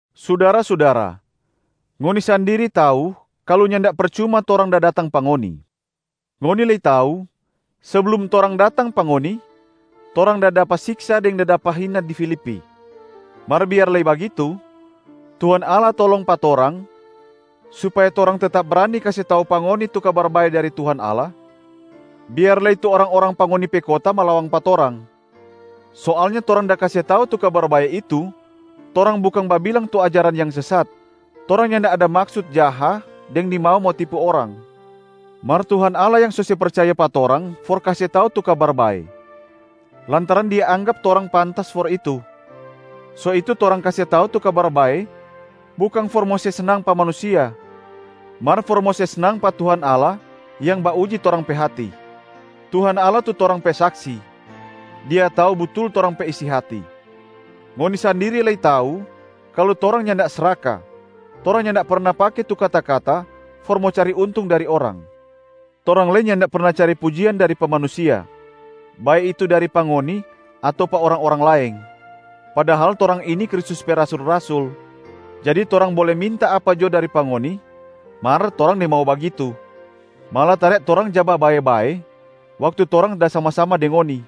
Sudara-sudara, ngoni sandiri tau kalu nyanda percuma torang da datang pa ngoni. Ngoni lei tau, seblum torang datang pa ngoni, torang da dapa siksa deng da dapa hina di Filipi. Mar biar lei bagitu, Tuhan Allah tolong pa torang supaya torang tetap brani kase tau pa ngoni tu Kabar Bae dari Tuhan Allah biar lei tu orang-orang pa ngoni pe kota malawang pa torang. Soalnya torang da kase tau tu Kabar Bae itu, torang bukang babilang tu ajaran yang sesat, torang nyanda ada maksut jaha deng nimau mo tipu orang. Mar Tuhan Allah yang so se percaya pa torang for kase tau tu Kabar Bae, lantaran Dia anggap torang pantas for itu. So itu torang kase tau tu Kabar Bae bukang for mo se snang pa manusia, mar for mo se snang pa Tuhan Allah yang bauji torang pe hati. Tuhan Allah tu torang pe saksi, Dia tau butul torang pe isi hati. Ngoni sandiri lei tau kalu torang nyanda sraka, torang nyanda perna pake tu kata-kata for mo cari untung dari orang. Torang lei nyanda perna cari pujian dari pa manusia, bae itu dari pa ngoni ato pa orang-orang laeng. Padahal torang ini Kristus pe rasul-rasul, jadi torang bole minta apa jo dari pa ngoni, mar torang nimau bagitu. Malatare torang ja babae-bae waktu torang da sama-sama deng ngoni,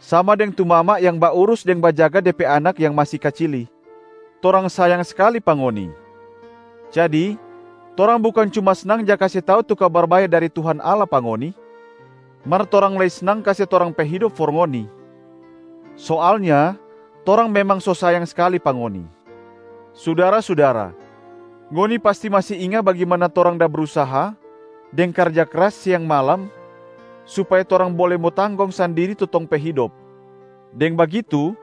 sama deng tu mama yang baurus deng bajaga de pe anak yang masi kacili. Torang sayang skali pa ngoni. Jadi torang bukang cuma snang ja kase tau tu Kabar Bae dari Tuhan Allah pa ngoni, mar torang lei snang kase torang pe hidop for ngoni. Soalnya torang memang so sayang skali pa ngoni. Sudara-sudara, ngoni pasti masi inga bagimana torang da brusaha deng karja kras siang malam supaya torang bole mo tanggong sandiri tu tong pe hidop. Deng bagitu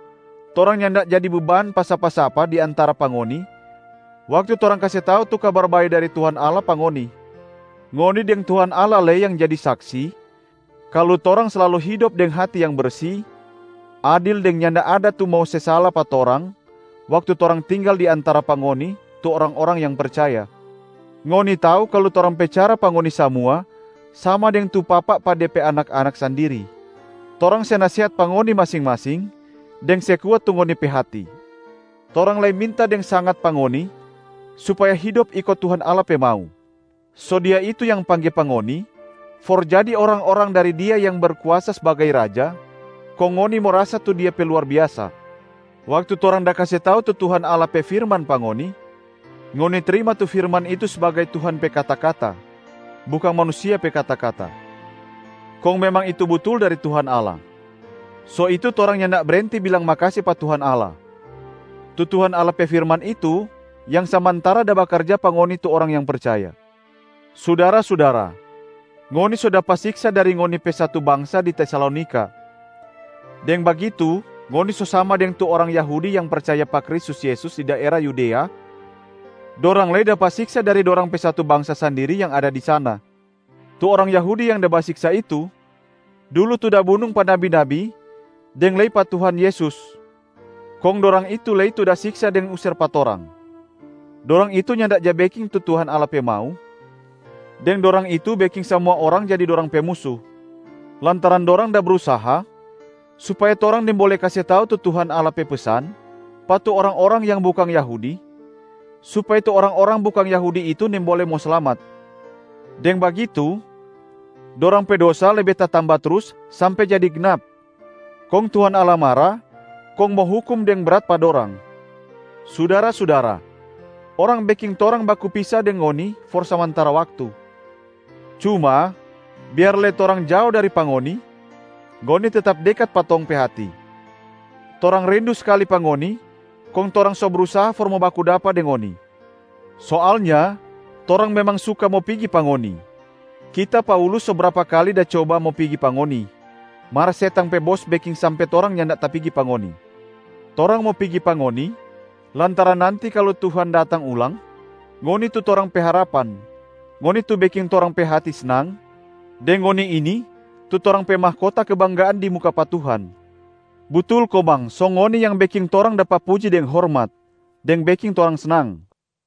torang nyanda jadi beban pa sapa-sapa di antara pa ngoni waktu torang kase tau tu Kabar Bae dari Tuhan Allah pa ngoni. Ngoni deng Tuhan Allah lei yang jadi saksi, kalu torang slalu hidop deng hati yang bersi, adil deng nyanda ada tu mo se sala pa torang waktu torang tinggal di antara pa ngoni tu orang-orang yang percaya. Ngoni tau kalu torang pe cara pa ngoni samua sama deng tu papa pa de pe anak-anak sandiri. Torang se nasehat pa ngoni masing-masing deng se kuat tu ngoni pe hati, torang lei minta deng sangat pa ngoni supaya hidop iko Tuhan Allah pe mau. So Dia itu yang pangge pa ngoni for jadi orang-orang dari Dia yang Berkuasa sbagai Raja, kong ngoni mo rasa tu Dia pe luar biasa. Waktu torang da kase tau tu Tuhan Allah pe firman pa ngoni, ngoni trima tu firman itu sbagai Tuhan pe kata-kata, bukang manusia pe kata-kata. Kong memang itu butul dari Tuhan Allah. So itu torang nyanda brenti bilang makase pa Tuhan Allah. Tu Tuhan Allah pe firman itu yang samantara da bakarja pa ngoni tu orang yang percaya. Sudara-sudara, ngoni so dapa siksa dari ngoni pe satu bangsa di Tesalonika. Deng bagitu ngoni so sama deng tu orang Yahudi yang percaya pa Kristus Yesus di daera Yudea, dorang lei dapa siksa dari dorang pe satu bangsa sandiri yang ada di sana. Tu orang Yahudi yang da basiksa itu dulu tu da bunung pa nabi-nabi deng lei pa Tuhan Yesus, kong dorang itu lei tu da siksa deng user pa torang. Dorang itu nyanda ja beking tu Tuhan Allah pe mau, deng dorang itu beking samua orang jadi dorang pe musu, lantaran dorang da brusaha supaya torang nimbole kase tau tu Tuhan Allah pe pesan pa tu orang-orang yang bukang Yahudi supaya tu orang-orang bukang Yahudi itu nimbole mo slamat. Deng bagitu dorang pe dosa lebe tatamba trus sampe jadi gnap,a kong Tuhan Allah mara kong mo hukum deng brat pa dorang. Sudara-sudara, orang beking torang baku pisa deng ngoni for samantara waktu. Cuma, biar lei torang jao dari pa ngoni, ngoni tetap dekat pa tong pe hati. Torang rindu skali pa ngoni kong torang so brusaha for mo baku dapa deng ngoni. Soalnya torang memang suka mo pigi pa ngoni. Kita Paulus so brapa kali da coba mo pigi pa ngoni, mar setang pe bos beking sampe torang nyanda tapigi pa ngoni. Torang mo pigi pa ngoni, lantaran nanti kalu Tuhan datang ulang, ngoni tu torang pe harapan, ngoni tu beking torang pe hati snang, deng ngoni ini tu torang pe mahkota kebanggaan di muka pa Tuhan. Butul komang, so ngoni yang beking torang dapa puji deng hormat, deng beking torang snang.